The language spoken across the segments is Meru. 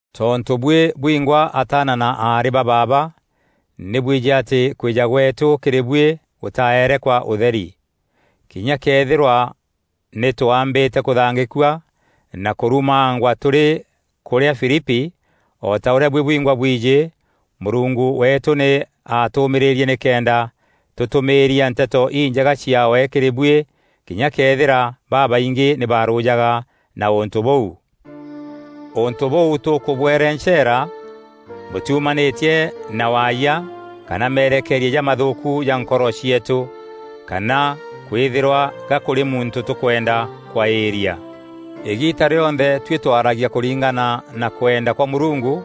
Tontû buî bwingwa ataana na aarî ba baaba nî bwijî atî kwîja gweetû kîrî buî gûtaeere kwa ûtheri. Kinya këethîrwa nî twaambîte kûthangîkua na kûrumangwa tûrî kûrîa Filipi, o ta ûrîa buî bwingwa bwijî, Mûrungu weetû nî atûûmîîrîrie nîkenda tûtûmîîria Nteto Injega ciaawe kîrî buî kinya këethîra babaingî nî barûjaga na ûntû bûu. Ûntû bûu tûkûbwerenceera bûtîumanîtie na waayia kana merekeeria jamathûûku ja nkoro cieetû, kana kwîthîrwa ga kûrî muntû tûkwenda kwaîria. Îgiita rîonthe tuî twaragia kûringana na kwenda kwa Mûrungu,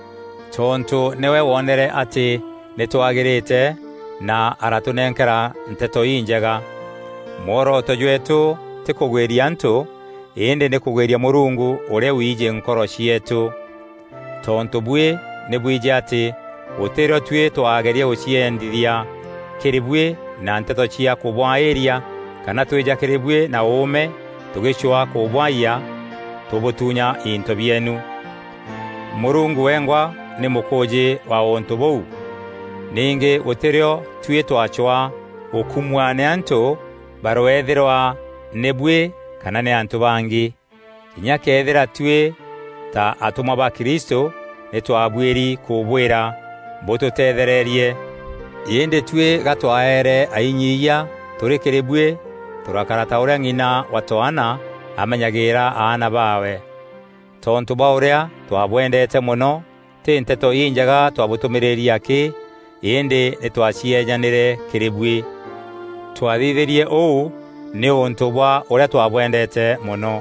tontû nîwe wonere atî nî twagîrîte na aratûnenkera Nteto Injega. Mworoto jweetû tî kûgwîria antû, îndî nî kûgwîria Mûrungu ûrîa wiijî nkoro cieetû. Tontû buî nî bwijî atî gûtî rîo tuî twaageria gûciendithia kîrî buî na nteto cia kûbwaîria kana twîja kîrî buî na ûûme tûgîcwaa kûbwaiyia tûbûtuunya into bieenu. Mûrungu wengwa nî mûkûûjî wa ûntû bûu. Ningî gûtî rîo tuî twacwaa gûkumua nî antû, barweethîrwa nî buî kana nî antû bangî. Kinya këethîra tuî ta atûmwa ba Kristû nî twabuîri kûbwîra bûtûteethererie. Îndî tuî ga twaeere ainyiiyia tûrî kîrî buî, tûrakara ta ûrîa ng'ina wa twaana amenyagîîra aana baawe. Tontû bwa ûrîa twabwendeete mono tî Nteto Injega twabûtûmîîrîrie akî, îndî nî twacieejanîre kîrî buî. Twathithîrie ûu nîûntû bwa ûrîa twabwendeete mono.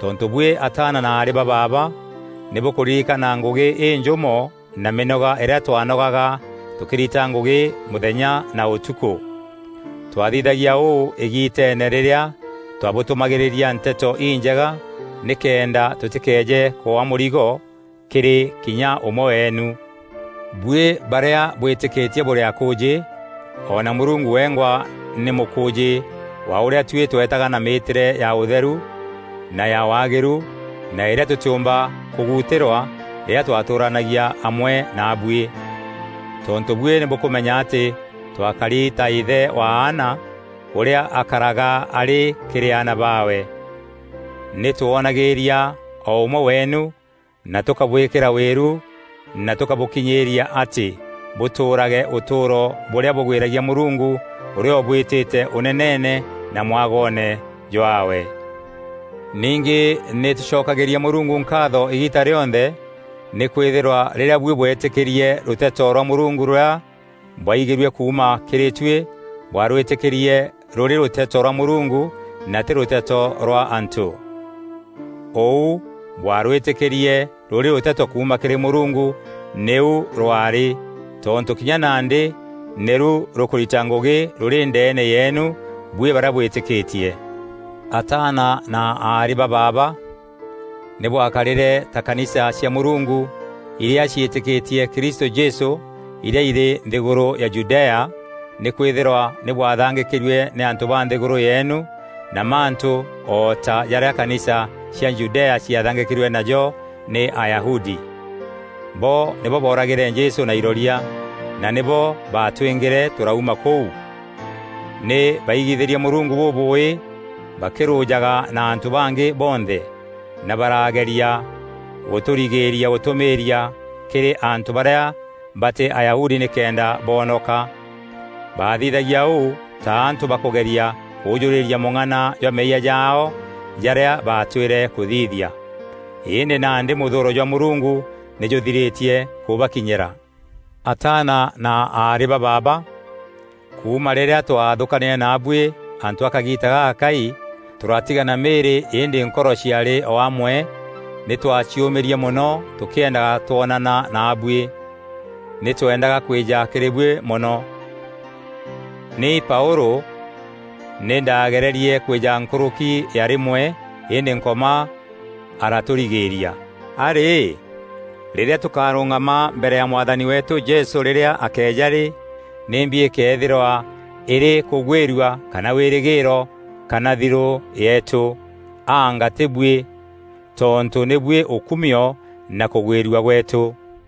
Tontû buî ataana na aarî ba baaba, nî bûkûririkana ngûgî înjûmo na mînoga îrîa twaanogaga tûkîrita ngûgî mûthenya na ûtukû. Twathithagia ûû îgiiteene rîrîa twabûtûmagîîria Nteto Injega nîkenda tûtîkeeje kwaa mûrigo kîrî kinya ûmwe weenu. Buî barîa bwîtîkîtie bûrî akûûjî, o na Mûrungu wengwa nî mûkûûjî wa ûrîa tuî tweetaga na mîîtîre ya ûtheru na ya waagîru na îrîa tûtîûmba kûguutîrwa rîrîa twatûûranagia amwe naabuî. Tontû buî nî bûkûmenya atî twakari ta îthe wa aana ûrîa akaraga arî kîrî aana baawe. Nî twoonagîîria o ûmwe weenu na tûkabwîkîra wîru na tûkabûkinyîîria atî, bûtûûrage ûtûûro bûrîa bûgwîragia Mûrungu ûrîa ûbwîtîte Ûneneene na mwagoone jwaawe. Ningî nî tûcokagîria Mûrungu nkaatho îgiita rîonthe nî kwîthîrwa rîrîa buî bwetîkîrie rûteto rwa Mûrungu rûrîa bwaigîrue kuuma kîrî tuî bwarwîtîkîrie rûrî rûteto rwa Mûrungu na tî rûteto rwa antû. Ûu bwaarwîtîkîrie rûrî rûteto kuuma kîrî Mûrungu nîu rwarî, tontû kinya nandî nîru rûkûrita ngûgî rûrî ndeene yeenu buî barîa bwîtîkîtie. Ataana na aarî ba baaba, nî bwakarîre ta kanisa cia Mûrungu irîa ciîtîkîtie Kristû Jesû irîa irî nthîgûrû ya Judea, nîkwîthîrwa nî bwathangîkîrue nî antû ba nthîgûrû yeenu na mantû o ta jarîa kanisa cia Judea ciathangîkîrue najo nî Ayahudi. Bo nîbo booragîre Jesû na iroria, na nîbo baatwîngîre tûrauma kûu. Nî baaigithîrie Mûrungu bûbûûî bakîrûjaga na antû bangî bonthe, na barageria gûtûrigîîria gûtûmîîria kîrî antû barîa batî Ayahudi nîkenda boonoka. Baathithagia ûu ta antû bakûgeria kûjûrîîria mûng'ana jwa meeyia jaao jarîa baatwîre kûthithia. Îndî nandî mûthûûro jwa Mûrungu nî jûthirîtie kûbakinyîra. Ataana na aarî ba baaba, kuuma rîrîa twaathûkanîre naabuî antû a kagiita gagakai, tûratigana mîîrî îndî nkoro ciaarî o amwe, nî twaaciûmîrie mono tûkîendaga twonana naabuî. Nî tweendaga kwîja kîrî buî mono. Ni Paûlû nî ndaagererie kwîja nkûrûki ya rîmwe îndî Nkoma aratûrigîîria. A rî, rîrîa tûkarûngama mbere ya Mwathani weetû Jesû rîrîa akeeja rî, nîmbi îkeethîrwa îrî kûgwîrua kana wîrîgîîro kana thirû yeetû? Anga tî buî? Tontû nî buî ûkumio na kûgwîrua gweetû.